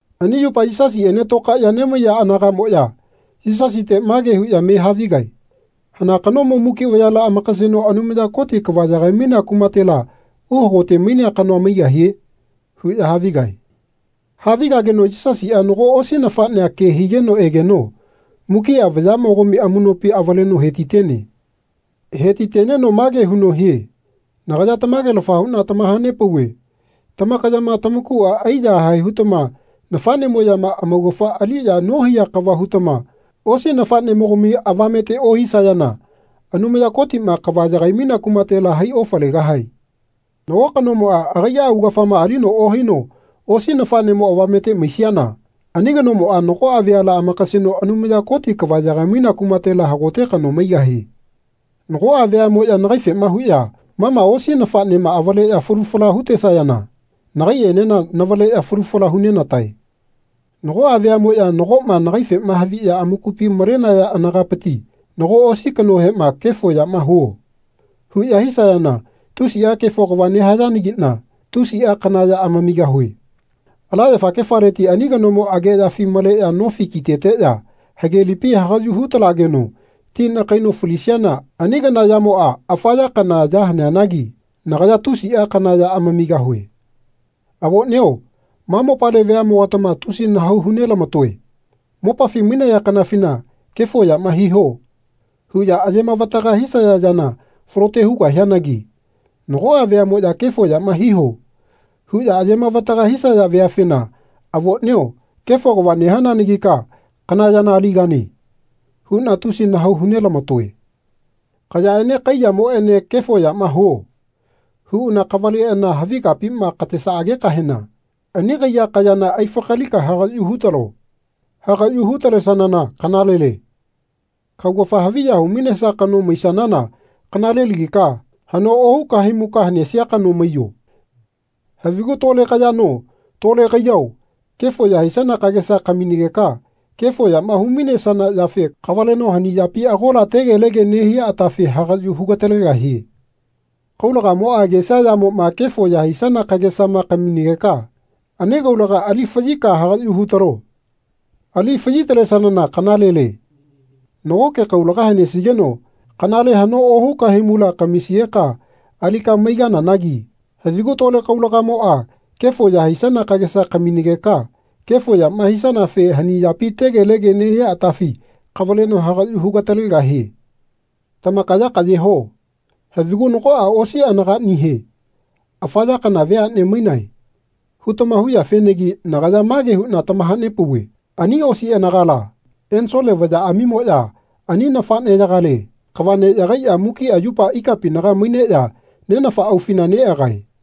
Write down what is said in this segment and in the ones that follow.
Ani yupa Yisasiꞌene tokaeꞌya nemaiya anagaꞌmoꞌya Yisasite mage huꞌya me havigae “Hana kanomo muki vayala amakaseno Anumaya Koti kava yagai-mainea kumatela uhakote-mainea kanoa maigahie.” huꞌya havigae. Havigageno Yisasiꞌa nago osi nafaꞌnea ke higeno egeno mukiꞌa vayaꞌmogami amuꞌnopi avaleno he-ti-tene. He-ti-teneno mage huno hie “Nagaya tamage-lafa huꞌna tamaha-nepauve tamakayama tamakuꞌa ai-yahae hutama nafaꞌnemoꞌyama amaugafa aliꞌya nohaiya kava hutama osi nafaꞌnemogami avamete ohisayana Anumaya Kotiꞌma kava yagai-mainea kumatela hai ofalegahae.” Nago kanomoꞌa agaiꞌa augafama alino ohaino osi nafaꞌnemo avamete maisiana ani kanomoꞌa nagoꞌa veala amakaseno Anumaya Koti kava yagai-mainea kumatela hagote kano maigahie. Nagoꞌa veaꞌmoꞌya nagaifema huꞌya ma ma osi nafaꞌnema avaleꞌya falu fala hu-tesayana nagaiꞌenena navaleꞌya falu fala hu-nenatae. Nagoꞌa veaꞌmoꞌya nagoꞌma nagaife haviꞌya amakupi malenaya anagapiti nago osi kanohema “Kefo yama huo.” huꞌya hisayana tusiꞌa kefo kava nehayanagiꞌna tusiꞌa kana ya amamigahue. Ala yafakefaleti ani kanomo ageꞌyafi maleꞌya nofi ki-teteꞌya hage lipi hagaꞌyu hu-talageno ti nakaino falisiana ani kana yamoꞌa afa ya kana ya haneanagi nagaya tusiꞌa kana ya amamigahue. Avoꞌnio ma mopale veaꞌmogatama tusi nahau hu-nelama-toe. Mopafi mainaya kanafina “Kefo yama hiho.” huꞌya aye-mavataga hisaya yana falote hugahianagi nagoꞌa veaꞌmoꞌya “Kefo yama hiho.” huꞌya aye-mavataga hisaya veafena “Avoꞌnio kefo kava nehananagika kana yana aligane.” huꞌna tusi nahau hu-nelama-toe. Kayaꞌene kaiyamoꞌene “Kefo yama huo.” huꞌana kavaleꞌana havi kapima katesaꞌagekahena ani kaiya kayana ai-fakalika hagaꞌyu hutalo. Hagaꞌyu hu-talesanana kanalele. Kaugafa haviya hu-mainesia kano maisanana kanalelagika haꞌno ohu kahaimuka hanesia kano maiyo. Havigu tole kayano tole kaiyao kefo ya hisana kagesa kaminegeka kefo yama hu-mainesana yafe kavaleno hani yapi agola tegelege nehia atafi hagaꞌyu hu-gatalegahie. Kaulagamoꞌa agesia yamoꞌma kefo ya hisana kagesama kaminageka ani kaulaga ali faꞌyika hagaꞌyu hutalo. Ali faꞌyi-talesanana kanalele. Nagoke kaulaga hanesigeno kanale haꞌno ohu kahaimula kamisigeka alika maigananagi havigu tole kaulagamoꞌa kefo ya hisana kagesa kaminegeka kefo yama hisanafe hani yapi tegelege nehia atafi kavaleno hagaꞌyu hu-ga-talegahie. Tamakaya kaꞌye ho. Havigu nagoꞌa osi anagaꞌnihe “Afa ya kana veaꞌne mainae.” hutama huyafenagi nagaya mage huꞌna tamaha-nepauve ani osi anagala ensole vayaꞌamimoꞌya ani nafaꞌneꞌyagale kava neꞌyagaiꞌya mukiꞌa yupa ikapinaga maineꞌya Nenafa aufina neꞌagae.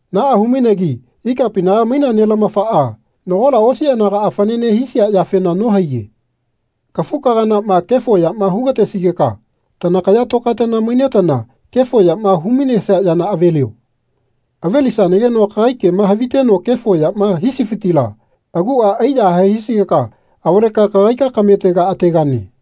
Naꞌa hu-mainegi ikapinaga mainea Nelamafaꞌa nagola osi anagaꞌa fanane hisia yafena nohaiye. Kafu-kaganaꞌma kefo yama hu-ga-tesigeka tanakaya tokaetana mainetana kefo yama hu-mainesia yana avelio. Ave-lisanageno kagai kema haviteno kefo yama hisifitila aguꞌa ai-yahae hisigeka avaleka kagaika kametega ategane.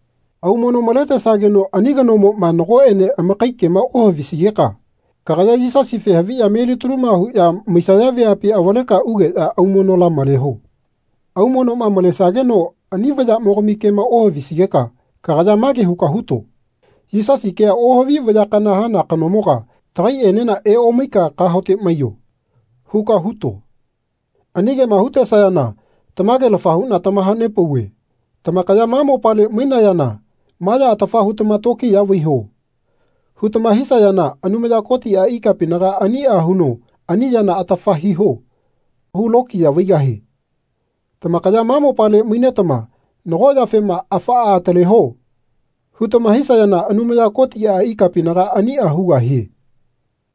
Aumono maletesageno ani kanoꞌmoꞌma nagoꞌene amakai kema ohavisigeka kagaya Yisasife haviꞌya melitaluma huꞌya maisaya veapi avaleka ugeꞌya aumonola maleho. Aumonoꞌma malesageno ani vayaꞌmogami kema ohavisigeka kagaya mage huka huto “Yisasi kea ohavi vaya kana hana kanomoga tagaiꞌenena eomaika kahaote maiyo.” huka huto. Ani kema hu-tesayana tamage-lafa huꞌna tamaha-nepauve tamakaya ma mopale mainayana “Ma ya atafa hutama tokiya vaiho.” hutama hisayana Anumaya Kotiꞌa ikapinaga aniꞌa huno “Ani yana atafa hiho.” hu-lokiya vaigahie. Tamakaya ma mopale mainetama nago yafema “Afaꞌa ataleho.” hutama hisayana Anumaya Kotiꞌa ikapinaga aniꞌa hugahie.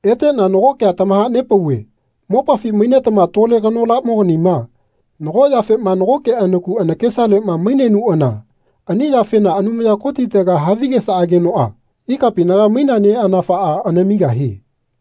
Eteꞌna nago kea tamaha-nepauve mopafi mainetama tole kanolaganima nago yafema nagoke anaku anakesaleꞌma mainenuꞌana ani yafena Anumaya Kotitega havigesaꞌageno ikapinaga mainea Neꞌanafaꞌa anamigahie.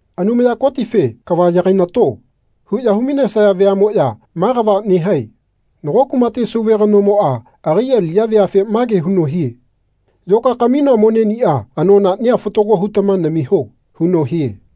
Anumaya Kotife “Kava yagai-nato.” huꞌya hu-mainesaya veaꞌmoꞌya ma kava nehae. Nago kumate sauve kanomoꞌa agai aliꞌya veafe mage huno hie “Yoka kaminoa moneꞌniꞌa anonaꞌnia fatago hutama namiho.” huno hie.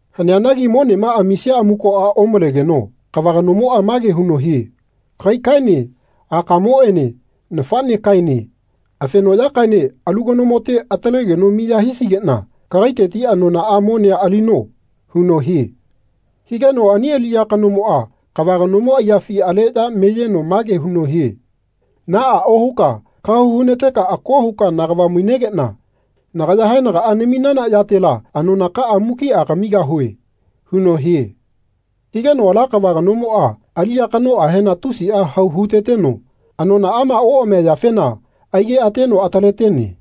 Haneanagi monema amisia amukoꞌa omalegeno kava kanomoꞌa mage huno hie “Kagaikaene akamoꞌene nafaꞌnekaene afenoꞌyakaene alu kanomote atalegeno miya hisigeꞌna kagaiteti anonaꞌa monea alino.” huno hie. Higeno ani aliꞌya kanomoꞌa kava kanomo aiyafi aleꞌya meyeno mage huno hie “Naꞌa ohuka kahau hu-na-teka ako huka nagava mainegeꞌna nagaya haenagaꞌa naminana yatela anonakaꞌa mukiꞌa kamigahue.” huno hie. Higeno ala kava kanomoꞌa aliꞌya kanoꞌahena tusiꞌa hau hu-teteno anonaꞌama oꞌamia yafena aigeꞌateno atale-tene.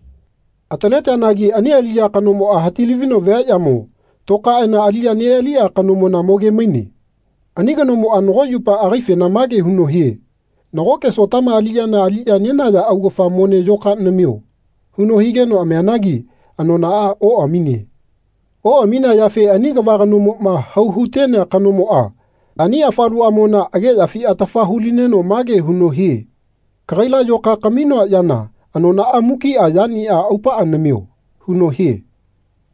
Atale-teanagi ani aliꞌya kanomoꞌa hati-lavino viaꞌyamo tokaeꞌana aliꞌya neꞌaliꞌa kanomona moge-maine. Ani kanomoꞌa nago yupa agaifena mage huno hie “Nagoke Sotama aliꞌyana aliꞌya nenaya augafa mone yoka namio.” huno higeno amianagi anonaꞌa oꞌamine. Oꞌaminea yafe ani kava kanomoꞌma hau hu-tenea kanomoꞌa ani afaluꞌamona ageꞌyafi atafa hu-lineno mage huno hie “Kagaila yoka kaminoa yana anonaꞌa mukiꞌa yaniꞌa aupaꞌa namio.” huno hie.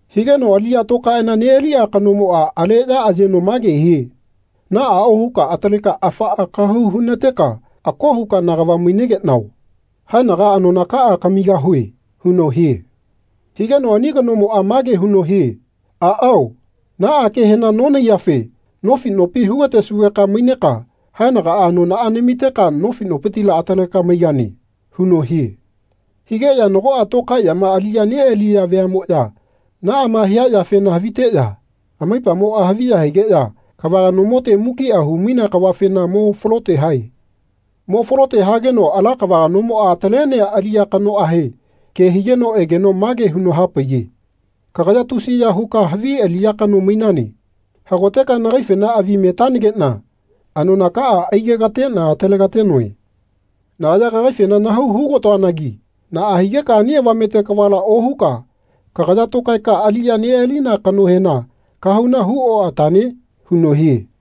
Higeno aliꞌya tokaeꞌana neꞌaliꞌa kanomoꞌa aleꞌya ayeno mage hie “Naꞌa ohuka ataleka afaꞌa kahau hu-na-teka ako huka nagava mainegeꞌnao. Haenaga anonakaꞌa kamigahue.” huno hie. Higeno ani kanomoꞌa mage huno hie “Aꞌao naꞌa kehena nonahaiyafe nofi nopi hu-ga-tesugeka maineka haenaga anonaꞌa namiteka nofi nopitila ataleka maigane.” huno hie. Higeꞌya nagoꞌa tokaeꞌyama aliꞌya neꞌaliya veaꞌmoꞌya naꞌama hia yafena haviteꞌya amaipamoꞌa haviya higeꞌya kava kanomote mukiꞌa hu-mainea kavafena mo falote hae. Mo falote hageno ala kava kanomoꞌa atale-tenea aliꞌya kanoꞌahe ke higeno egeno mage huno ha-paiye “Kagaya tusiya huka havi aliꞌya kano mainane. Hagoteka nagaifena avi metanageꞌna anonakaꞌa aigekateꞌna atalega-tenoe. Nagaya kagaifena nahau hu-ga-toanagi naꞌa higeka ani avamete kavala ohuka kagaya tokaeka aliꞌya neꞌalina kanohena kahauna hu-oꞌatane?” huno hie.